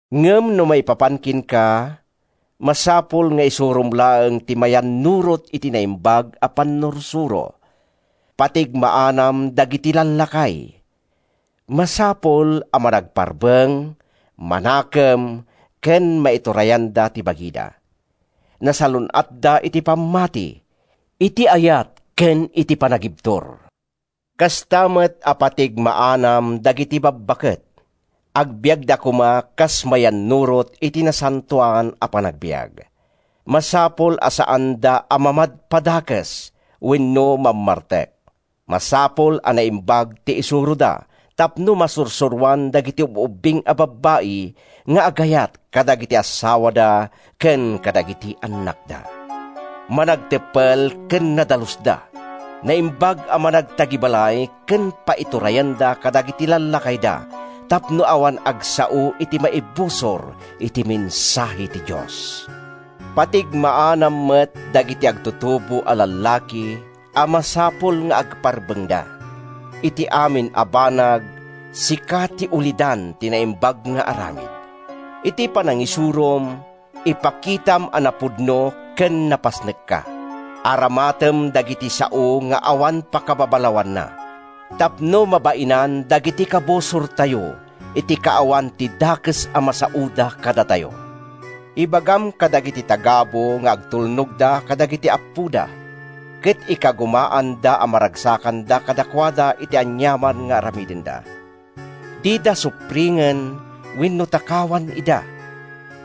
Ngem no maipapan kenka, masapul nga isurom laeng ti mayannurot iti naimbag a pannursuro. Patigmaanam dagiti lallakay: Masapul a managparbeng, manakem ken maiturayanda ti bagida. Nasalun-atda iti pammati, iti ayat ken iti panagibtur. Kasta met a patigmaanam dagiti babbaket: Agbiagda koma kas mayannurot iti nasantoan a panagbiag. Masapul a saanda a mamadpadakes wenno mammartek. Masapul a naimbag ti isuroda tapno masursuroan dagiti ub-ubing a babbai nga agayat kadagiti assawada ken kadagiti annakda. Managteppel ken nadalusda, naimbag a managtagibalay ken paiturayanda kadagiti lallakayda tapno awan agsao iti maibusor iti mensahe ti Dios. Patigmaanam met dagiti agtutubo a lallaki a masapul nga agparbengda. Iti amin a banag, sika ti ulidan ti naimbag nga aramid. Iti panangisurom, ipakitam a napudno ken napasnekka. Aramatem dagiti sao nga awan pakababalawanna tapno mabainan dagiti kabusortayo iti kaawan ti dakes a masaoda kadatayo. Ibagam kadagiti tagabu nga agtulnogda kadagiti appoda ket ikagumaanda a maragsakanda kadakuada iti aniaman nga aramidenda. Dida supringen wenno takawan ida,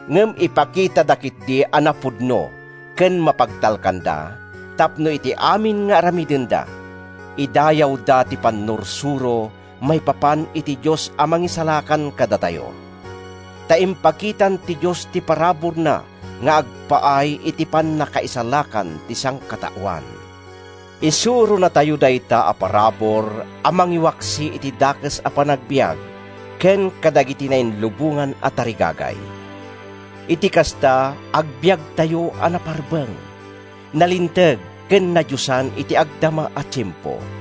ngem ipakitada ketdi a napudno ken mapagtalkanda, tapno iti amin nga aramidenda, idayawda ti pannursuro maipapan iti Dios a Mangisalakan kadatayo. Ta impakitan ti Dios ti paraburna nga agpaay iti pannakaisalakan ti sangkataoan. Isuronatayo dayta a parabur a mangiwaksi iti dakes a panagbiag ken kadagiti nailubongan a tarigagay. Iti kasta, agbiagtayo a naparbeng, nalinteg ken nadiosan iti agdama a tiempo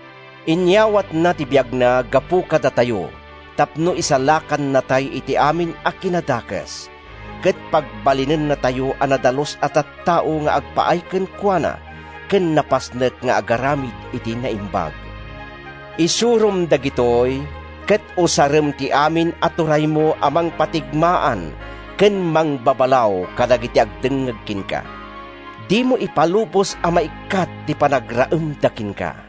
Inyawatna ti biagna gapu kadatayo tapno isalakannatay iti amin a kinadakes ket pagbalinennatayo a nadalus a tattao nga agpaay kenkuana ken napasnek nga agaramid iti naimbag. Isurom dagitoy, ket usarem ti amin a turaymo a mangpatigmaan ken mangbabalaw kadagiti agdengngeg kenka. Dimo ipalubos a maikkat ti panagraemda kenka.